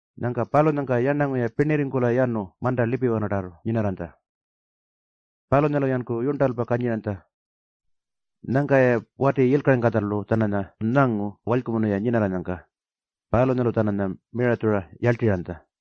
Nyangka palunyangka yarnangu-ya pirnirringkula yanu manta lipiwanatarrartu nyinarranytja. Palunyalu-yanku yurntalpa kanyiranytja. Nyangka-ya wati yilkaringkatjalu-tjananya nyangu walykumunu-ya nyinarranyangka. Palunyalu-tjananya miratjura yarltirranytja.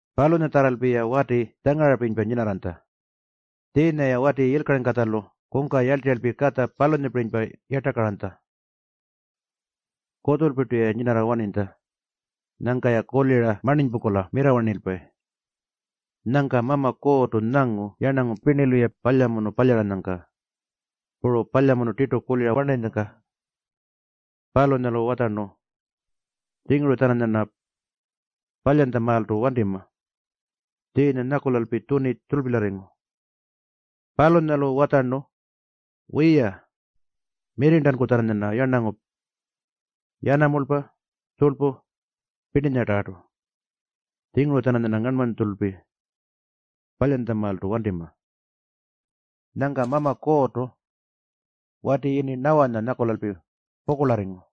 Palunyatjarralpi-ya wati tjangarapirinypa nyinarranytja. Tjiinya-ya wati yilkaringkatjalu kungka yarltirralpi katja palunyapirinypa yartakaranytja. Kutjulpirtulpi-ya nyinarranytja. Nyangka-ya kulira marninypungkula mirrawarnipayi. Nyangka Mama Kuurrtu nyangu yarnangu pirnilu-ya palyamunu palyaranyangka puru palyamunu tirtu kuliranyangka. Palunyalu watjarnu, “Tjinguru-tjananyarna palyantjamaaltu wantima.” Tjiinya nyakulalpi tjuni tjurlpilyarringu. Palunyalu watjarnu, “Wiya, mirrirntanku-tjananyarna yarnangu, yanamulpa puru tjurlpu pirninyatarrartu. Tjinguru-tjananyarna ngarnmanytjulpi palyantjamaaltu wantima.” Nyangka Mama Kuurrtu wati yini Nawanya nyakulalpi pukurlarringu.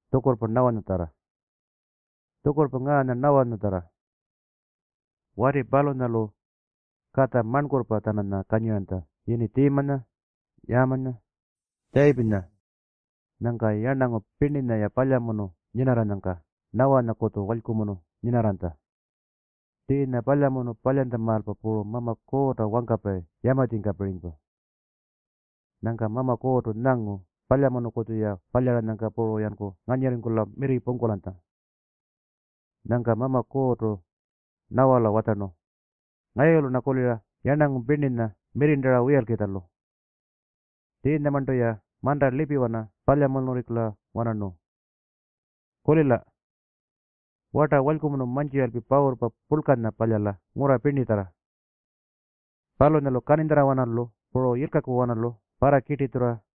Tjukurrpa ngaanya Nawanyatjarra. Wati palunyalu katja marnkurrpa-tjananya kanyiranytja yini Tjiimanya, Yaamanya, Tjayipinya. Nyangka yarnangu pirninya-ya palyamunu nyinarranyangka Nawanyakutju walykumunu nyinarranytja. Tjiinya palyamunu palyantjamaalpa puru Mama Kuurrta wangkapayi yamatjingkapirinypa. Nyangka Mama Kuurrtu nyangu palyamunukutju-ya palyaranyangka puru-yanku nganyirrirringkula mirri pungkulanyangka. Nyangka Mama Kuurrtu Nawala watjarnu, “Ngayulu-rna kulira yarnangu pirninya mirrirntara wiyalkitjalu. Tjiinyamarntu-ya manta lipiwanartu palyamunurringkula-wanarnu. Kulila. Warta walykumunu mantjiralpi pawurrpa purlkanya palyala ngurra pirnitjarra. Palunyalu kaninytjarrawanalu puru yilkakuwanalu parrakirtitjurra.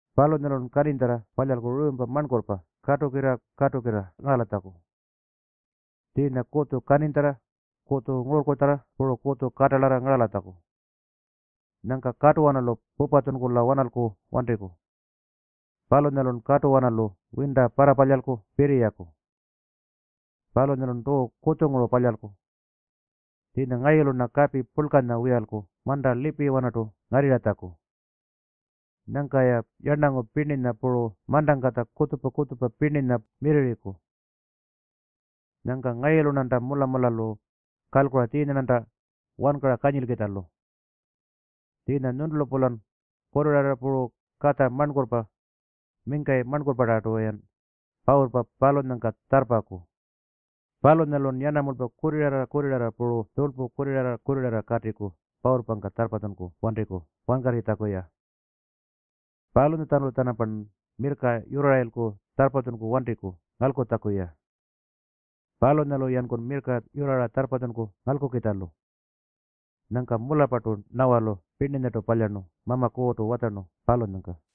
Palunyalun kaninytjarra palyalku ruumpa marnkurrpa katulkirra-katulkirra ngaralatjaku, tjiinya kutju kaninytjarra, kutju ngururrkutjarra puru kutju katalarra ngaralatjaku. Nyangkan katuwanalu pupatjunkula-wanalku wantiku. Palunyalun katuwanalu winta parrapalyalku pirriyaku. Palunyalun tuu kutjunguru palyalku. Tjiinya ngayulu-rna kapi purlkanya wiyalku manta lipiwanartu ngarrirratjaku. Nyangka-ya yarnangu pirninya puru mantangkatja kutjupa-kutjupa pirninya mirrirriku. Nyangka ngayulu-rnanta mula-mulalu kalkura tjiinya-rnanta wankara kanyilkitjalu. Tjiinya nyuntulu-pulan kurrirarra puru katja marnkurrpa, mingkayi marnkurrpatarrartu-yan pawurrpa palunyangka tjarrpaku. Palunyalun yanamulpa kurrirarra-kurrirarra puru tjurlpu kurrirarra-kurrirarra katiku pawurrpangka tjarrpatjunku wantiku wankarritjaku-ya. Palunyatjanulu-tjanampan mirrka yurrarayilku tjarrpatjunku wantiku ngalkulatjaku-ya. Palunyalu-yanku mirrka yurrara tjarrpatjunku ngalkukitjalu.” Nyangka mularrpartu Nawalu pirninyartu palyarnu Mama Kuurrtu watjarnu palunyangka.